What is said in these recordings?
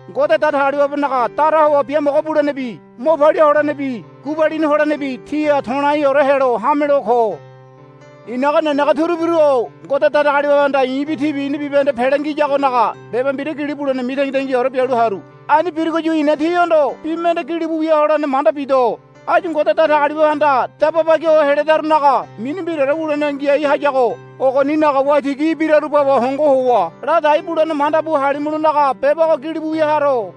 Ngode Datagaliwabenaga dara howa biamogo bulenebi mo palia holenebi gubalini holenebi tíha to̱laiore helo hamelo ko. I̱naga nenege turubiru-o Ngode Datagaliwabehanda i̱bi tíbi ina bibahende pele ngiyagonaga beba mbira gili bule mitangitangiore bialu haru. Ani birugoyu i̱na tíhondo bi mende gilibu wia holene manda bido. Áyu Ngode Datagaliwabehanda daba bagiho heledarunaga mini mbiraore wulene ngiai hayago ogoninaga waitigi ibiraru baba hongo howa ladai bulene mandabu halimulonaga beba ogo gilibu wia haro.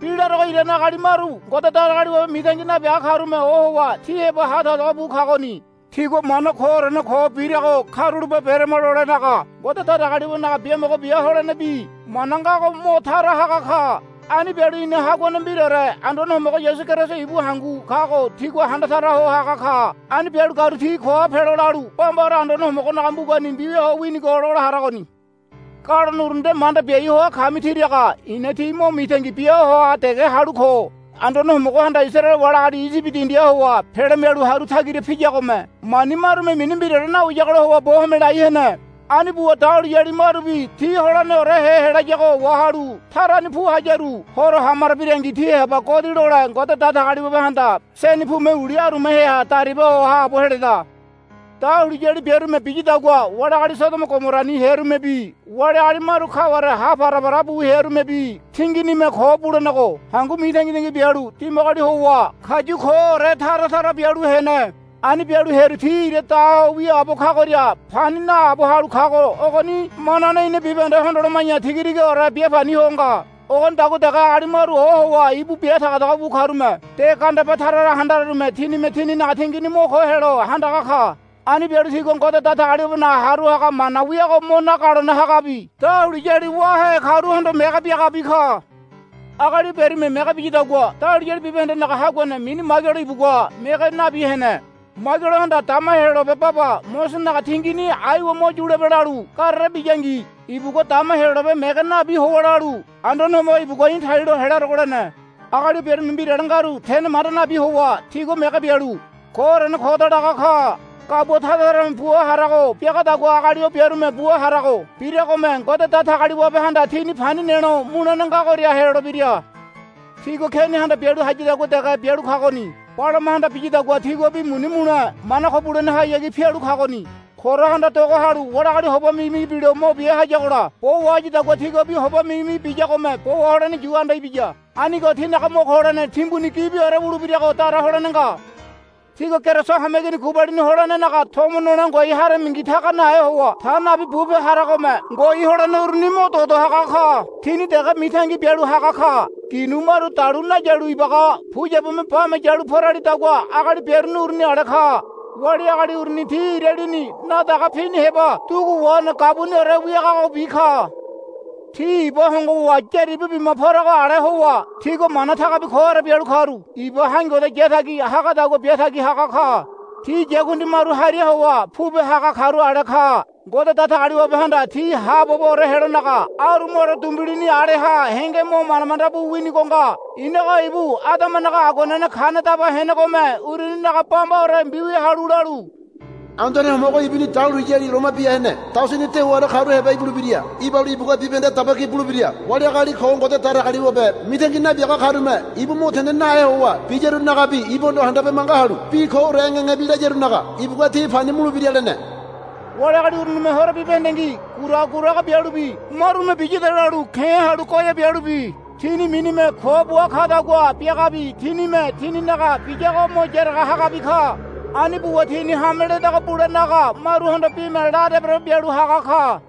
Bi larogo irane agali maru Ngode Datagaliwabe mitangi nabiaga karume ohowa tí heba tagotago bu kagoni. Tigua mana koorene ko birago karulape berama lolenaga Ngode Datagaliwabenaga biamogo bia holene bi mana ngago mo tara haga ka. Ani bialu ina Haguane mbiraore Anduane Homogo Yasu Keriso ibu hangu kago tigua handa tara ho haga ka. Ani bialu karu tí koha pelo lalu bambaore Anduane Homogonaga mbugani mbiwia ho winigo lola haragoni. Galone uru nde manda biai ho kami tiraga i̱na tí mo mitangi bia hoa dege halu ko. Anduane Homogohanda Isaraele wali agali Iyibi dindiha howa pele mialu haru tagira piyagome mani marume mini mbiraore nawiyagola howa bo home lai hene. Ani buwa dahuliyali marubi ti holeneniore helayago wahalu tarani pu hayaru Horo hamaro birangi ti heba godi lole Ngode Datagaliwabehanda seni pume uli arumaheha dariba ho haabo heleda. Dahuliyali biarume biyadagua wali agali Sodomo Gomorani hearumebi wali agali maru kaware ha parapara bu hearumebi tinginime ko bulenego hangu mitangitangi bialu dimagoli howa kayu koore tara tara bialu hene. Ani bialu hearu ti ira da ho wiaabo kagoria pani naabo halu kago ogoni manane ina bibahende hondoloma̱ya tigatigaore biapani ho nga. Ogonidagua dege agali maru ohowa íbu bi tagotago bu karume de gandeba tara tara handararume tinime tinaga tingini mo ko helo handaga ka. Ani bialu tigua Ngode Datagaliwabenaga haru haga mana wiago mo nagalone hagabi dahuliyali wáhe karuhondo mege biagabi ka. Agali o biarume mege biyadagua dahuliyali bibahendenaga haguane mini Maigelo ibugua mege nabi hene. Maigelohanda dama Heyolabe baba Mosesenaga tingini aiwa mo yulebe lalu garere biyangi ibugua dama Heyolabe mege nabi howa lalu, Anduane Homogo ibugua í̠ talilo helarogo, lene. Agali o biarume mbirale ngaru tene manda nabi howa tigua mege bialu, Koorene koda, laga ka. Gabua tara tarame bua harago biagadagua agali o biarume bua harago biragome Ngode Datagaliwabehanda tini pani nelo mulene ngagoria helolebira. Tigua Kenihanda bialu hayadagua dege bialu kagoni. Balamahanda biyadagua tiguabi muni mule mana ko bulenehayagi pialu kagoni. Korahanda doga halu wali agali hoba migimigi bilo mo bia hayagola bo wahayadagua tiguabi hoba migimigi biyagome bo waholene yu anda ibiya. Anigo tinaga mo ko holene timbu gibiore wulebirago dara holene nga. Tígua Keriso hameigini gubalini holenenaga tomo nole ngoai haramingi taga nahe howa ta nabi bupe haragome ngoai holene uruni mo dodo haga ka. Tini dege mitangi bialu haga ka. Ginu maru dalu nayalu ibaga puyabume bame yalu poralidagua agali biaruni uruni ale ka. Wali agali uruni ti ira lini nadaga pini heba dugu wahene gabuniore wiagagobi ka. Ti iba hongo howa yaribu bima porago ale howa tigua mana tagabi koore bialu karu iba haingoda yatagi hagadagua biatagi haga ka. Ti yakundi maru hariha howa pupe haga karu ale ka. Ngode Datagaliwabehanda ti haaboboore helonaga arumaore dumbilini aleha henge mo manda manda bu winigo nga. Inogo ibu Adamanaga aguanene kane daba henegome uruninaga bambaore mbiwia halu lalu, Anduane Homogo ibuni dahuliyali loma bia hene daosini dewaore karu heba ibulebira. Ibalu ibugua bibahende daba ki bulebira. Wali agali ko Ngode Datagaliwabe mitangi nabiaga karume ibu mo tene nahe howa biyarunagabi ibuhondo handabe manga halu bi koore engengebi layarunaga ibugua ti pani mulebira, lene. Wali agali urunime horo bibahendengi guraga guraga bialubi marume biyada lalu ke̱ halu goea bialubi tini minime ko bua kadagua biagabi tinime tininaga biyago mo yaraga hagabi ka. Ani buwa tini hame ledago bulenaga maruhondo bime la deborebo bialu haga ka.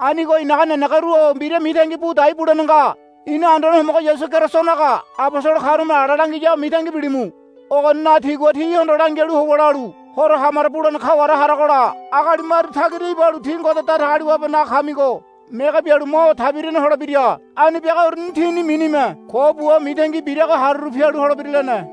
Anigo i̱naga nenegeru-o mbira mitangi bu dai bulene nga. Ina Anduane Homogo Yasu Kerisonaga abosolo karume ala langiyago mitangi bilimu. Ogoninaga tigua tíhondo langialu howa lalu, Horo hamaro bulene kaware haragola agali maru tagira ibalu tí Ngode Datagaliwabenaga kamigo mege bialu mo tabirane holebira. Ani biaga uruni tini minime ko bua mitangi birago haruru pialu holebira, lene.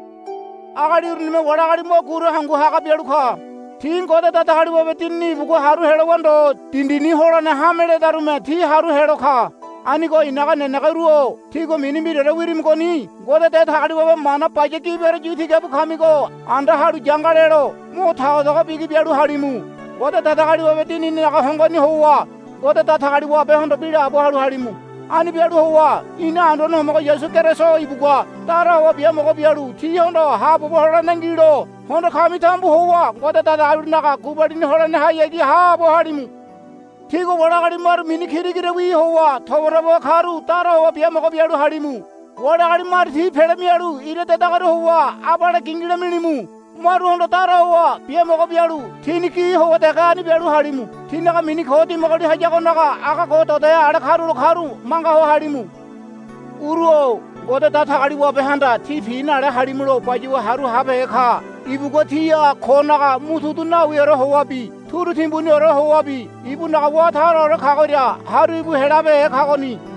Agali urunime wali agali mo guru hangu haga bialu ka. Ti Ngode Datagaliwabe Dinini ibugua haru helowa ndo dindini holene hame ledarume ti haru helo ka. Anigo i̱naga nenege uru-o tígua mini mbiraore wirimigoni Ngode Datagaliwabe mana baya gibiore yu tiga bu kamigo anda halu yanga lelo mo tagotago bigi bialu halimu. Ngode Datagaliwabe Dinininaga hongoni howa Ngode Datagaliwabehondo bi laabo halu halimu. Ani bialu howa ina Anduane Homogo Yasu Keriso ibugua dara howa biamogo bialu tíhondo haabobo holene ngilo hondo kami tambu howa Ngode Datagaliwabenaga gubalini holenehayagi haabo halimu. Tígua wali agali maru mini kira kirawi howa tobatobaho karu dara howa biamogo bialu halimu. Wali agali maru ti pele mialu ira dedagoria howa abale gilila milimu. Maruhondo dara howa biamogo bialu tíni gi howa dege ani bialu halimu. Tinaga mini ko dimagoli hayagonaga aga dodohe ale karulo karu manga ho halimu. Uru-o Ngode Datagaliwabehanda tí pi nale halimulo bayuwa haru habehe ka. Ibugua tíha konaga motudu nawiore howabi turu timbuniore howabi ibunaga wá taraore kagoria haru íbu helabehe kagoni.